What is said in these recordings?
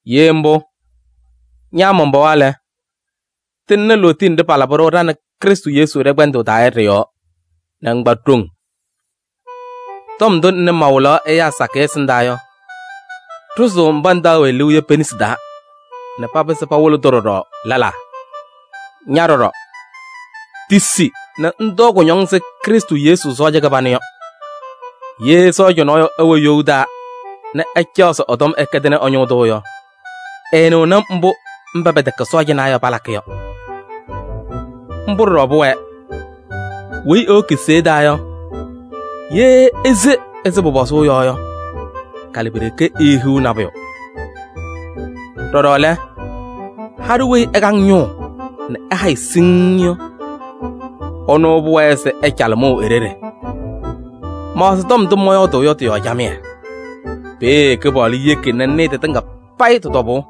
Ye mbʋ, ña man-pɩɣa lɛ, tɩŋnɩ lootiye nɖɩ palabɩ-ɖʋ ɖa nɛ Krɩstʋ Yesu ɖɛ-kpɛndʋʋ taa yɔ ɖɩ-yɔɔ nɛ ŋkpa ɖoŋ. Tɔm ndʋ ŋnɩ mawɩlaɣ ɛyaa sakɩyɛ ɛsɩndaa yɔ, ɖʋzɩ-tʋ mba ŋtaɣ-wɛ liu yɔ pe-nesi taa nɛ papɩzɩ pawɩlɩ-tʋ ɖɔɖɔ lɛlaa. Ña ɖɔɖɔ, tisi nɛ ŋtɔɔ kʋñɔŋ ɛzɩ Krɩstʋ Yesu sɔɔja kɩbanʋ yɔ. Ye sɔɔja nɔɔyʋ ɛwɛ you taa nɛ ɛcaɣ se ɛ-tɔm ɛkɛdɩnɩ ɛ-ñʋʋ tʋ yɔ, ɛɛnɩɣnɩ mbʋ mba pɛtɛkɛ sɔɔjanaa yɔ palakɩ yɔ. Mbʋ ɖɔɖɔ pʋwɛɛ: weyi ewoki seya taa yɔ, ye ese ɛzɩ pʋpɔzʋʋ yɔ yɔ, kalɩ pi-ɖeke eehiɣ nabʋyʋ. Ɖɔɖɔ lɛ, haɖʋ weyi ɛkaŋ ñʋʋ nɛ ɛhayɩ siŋŋ yɔ, ɛnʋ pʋwɛɛ se ɛcalɩ mʋʋ e-ɖeɖe. Maɣzɩ tɔm ndʋ mɔyɔɔdʋʋ yɔ tɩ-yɔɔ camɩyɛ, peeye Kɩpaɣlʋ yeki nɛ ŋnɩɩ tɩtɩŋa payɩ tɩ-tɔbʋʋ.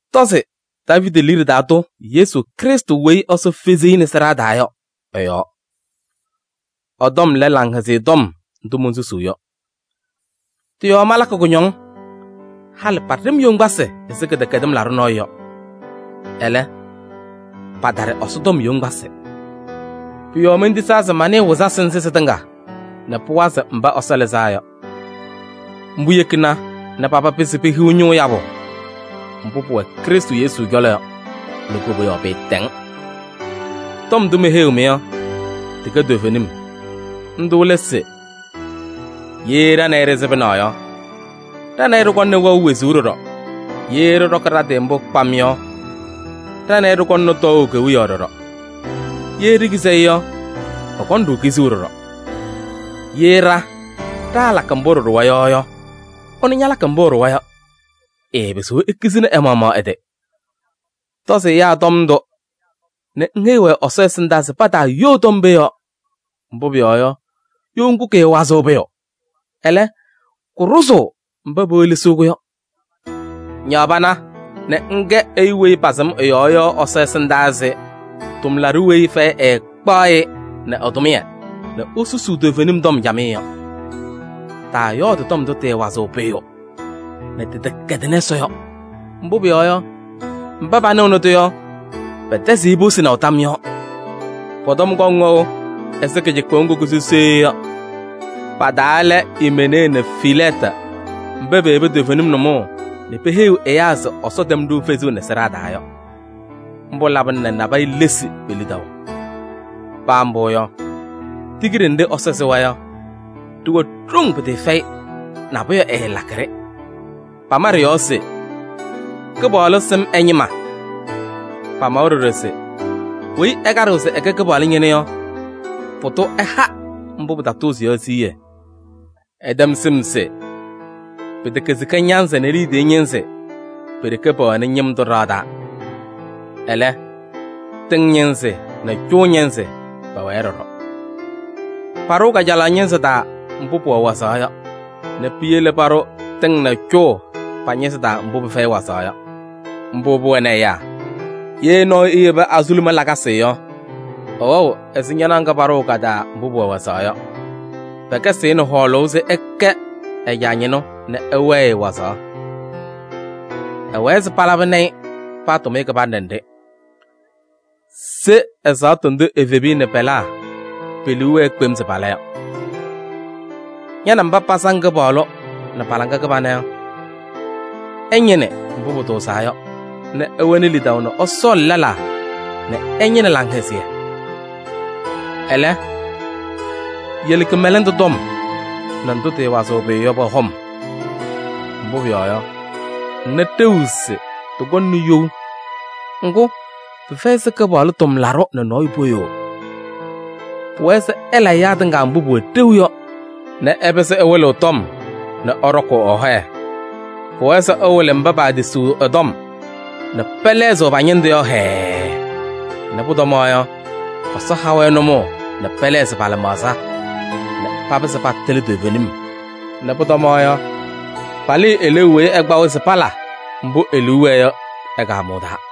Tɔzɩ Daaviidi liɖe taa tʋ Yesu Krɩstʋ weyi Ɛsɔ fezi-i nɛ sɩɖaa taa yɔ ɛ-yɔɔ. Ɛ-tɔm lɛ Laŋhɛzɩyɛ Tɔm ndʋ monsusuu yɔ. Tɩ-yɔɔ malakɩ kʋñɔŋ, halɩ paɖɩ-m yoŋgbasɩ ɛzɩ kɩdɛkɛdɩm laɖʋ nɔɔyʋ yɔ. Ɛlɛ, pataɖɩ Ɛsɔ tɔm yoŋgbasɩ. Pʋ-yɔɔ mentisaa se manɩɩ wɩzasɩ nzɩ sɩtɩŋa nɛ pʋwazɩ mba Ɛsɔ lɩzaa yɔ. Mbʋ yekina nɛ paba pɩzɩ pehiɣ ñʋʋ yabʋ mbʋ pʋwɛ Krɩstʋ Yesu cɔlɔ yɔ nɛ koboyaɣ pɩɩtɛŋ. Tɔm ndʋ meheyiɣ-mɩ yɔ, tɩkɛ toovenim. Ndʋ lɛ se: “Ye ɖa nɛ ɩ ɖɩsɩbɩna yɔ, ɖa nɛ ɩ ɖɩkɔŋnɩ wɛʋ wezuu ɖɔɖɔ. Ye ɖɩɖɔkɩ ɖa-tɩ mbʋ kpam yɔ, ɖa nɛ ɩ ɖɩkɔŋnɩ tɔɔʋ kewiyaɣ ɖɔɖɔ. Ye ɖikizi-i yɔ, ɛkɔŋ-ɖʋ kizuu ɖɔɖɔ. Ye ɖa ɖaalakɩ mbʋ ɖɩɖʋwa yɔ yɔ, ɛnʋ ñalakɩ mbʋ ɛɖʋwa yɔ, ɛɛpɩzɩɣ ekizini ɛ-maɣmaɣ ɛ-tɩ.” Tɔzɩ ɛyaa tɔm ndʋ nɛ ŋheyi-wɛ Ɛsɔ ɛsɩndaa se pataayoo tɔm pee yɔɔ. Mbʋ pʋyɔɔ yɔ, you ŋgʋ kɩɩwazɩɣ pʋyʋ, ɛlɛ, kʋɖʋzʋʋ mba pewelesiɣ-kʋ yɔ. Ñaɣ pana nɛ ŋkɛ ɛyʋ weyi pasɩm ɛ-yɔɔ yɔ Ɛsɔ ɛsɩndaa ɛzɩ tʋmlaɖʋ weyi fɛyɛ ɛɛkpaɣ-ɩ nɛ ɛ-tʋmɩyɛ nɛ esusuu toovenim tɔm camɩyɛ yɔ. Taayɔɔdɩ tɔm ndʋ tɩɩwazɩɣ pʋyʋ nɛ tɩtɛkɛdɩnɩ Ɛsɔ yɔ, mbʋ pʋyɔɔ yɔ, mba panɩɣnɩ-tʋ yɔ, pɛtɛzɩɣ-ɩ posinaʋ tam yɔɔ. Pɔ-tɔm kɔŋ wɛʋ ɛzɩ kɩcɩkpʋʋ ŋgʋ kʋsʋ sooye yɔ. Pa-taa lɛ: Imenee nɛ Filɛɛtɩ mba peyebi toovenim nʋmɔʋ nɛ peheyiɣ ɛyaa se Ɛsɔ tɛm-ɖʋ fezuu nɛ sɩɖaa taa yɔ. Mbʋ labɩna nɛ nabɛyɛ lesi pe-lidaʋ. Paa mbʋ yɔ, tigiɖe nɖɩ Ɛsɔ sɩwa yɔ, ɖɩwɛ ɖoŋ pɩtɩɩfɛyɩ, nabʋyʋ ɛɛlakɩ-ɖɩ. Pama ɖɩ-yɔɔ se: “Kɩpaɣlʋ sɩm ɛ-ñɩma.” Pamawa ɖɔɖɔ se: “Weyi ɛkaɖɩɣ se ɛkɛ Kɩpaɣlʋ ñɩnʋ yɔ, pʋdʋ ɛha mbʋ pɩtatʋʋzɩ yɔ siɣye.” Ɩtɛm sɩm se: pɩtɛkɛ sika ñanzɩ nɛ liidiye ñɩnzɩ pe-ɖeke pɛwɛnɩ ñɩm tʋ ɖɩɣa taa. Ɛlɛ, tɩŋ ñɩnzɩ nɛ cʋʋ ñɩnzɩ pɛwɛɛ ɖɔɖɔ. Paɖʋʋ kajalaɣ ñɩnzɩ taa mbʋ pʋwɛ wazaɣ yɔ nɛ piyele paɖʋ tɩŋ nɛ cʋʋ pa-ñɩnzɩ taa mbʋ pɩfɛyɩ wazaɣ yɔ. Mbʋ pʋwɛnɩ ɛyaa: ye nɔɔyʋ eyebi azuluma lakasɩ yɔ, ɛwɛɣ ɛzɩ ñanaɣ ŋga paɖʋʋ ka-taa mbʋ pʋwɛ wazaɣ yɔ. Pɛkɛzɩɣ-ɩ nɛ hɔɔlʋʋ se ɛkɛ ɛ-caa ñɩnʋ nɛ ɛwɛɛ-ɩ wazaɣ. Ɛwɛɛ se palabɩnɩ-ɩ paa tʋmɩyɛ kɩbanɖɛ nɖɩ. Se ɛzaɣtʋ ndʋ evebiya nɛ pɛlaa pe-liu wɛɛ kpem se pala yɔ. Ña nɛ mba pasaŋ Kɩpaɣlʋ nɛ laŋa kɩbana yɔ, ɩñɩnɩ mbʋ pʋtʋʋzaa yɔ nɛ ɩwɛnɩ lidaʋ nɛ ɩsɔɔlɩ lɛlaa nɛ ɩñɩnɩ laŋhɛzɩyɛ. Ɛlɛ, yele kɩmɛlɛndʋ tɔm nɛ ndʋ tɩɩwazɩɣ pʋyʋ yɔ pɔ-hɔm, mbʋ pʋyɔɔ yɔ, ŋna ɖeu se tɩkɔŋnɩ you. Ŋgʋ, pɩfɛyɩ se Kɩpaɣlʋ tʋmlaɖʋ nɛ nɔɔyʋ poyoo. Pʋwɛɛ se ɛla ɛyaa tɩŋa mbʋ pʋwɛ ɖeu yɔ nɛ ɛpɩzɩ ɛwɩlɩɣ tɔm nɛ ɛɖɔkʋʋ ɛ-hɔyɛ. Pʋwɛɛ se ɛwɩlɩ mba paatisiɣ ɛ-tɔm nɛ pɛlɛɣzɩɣ pa-ñɩndʋ yɔ hɛɛɛ nɛ pʋtɔma yɔ, Ɛsɔ ha-wɛ nʋmɔʋ nɛ pɛlɛɣzɩ pa-lɩmaɣza nɛ papɩzɩ patɩlɩ toovenim nɛ pʋtɔma yɔ, palɩɩ eleeu weyi ɛkpa-wɛ se pala mbʋ e-liu wɛɛ yɔ ɛ-kaamʋʋ taa.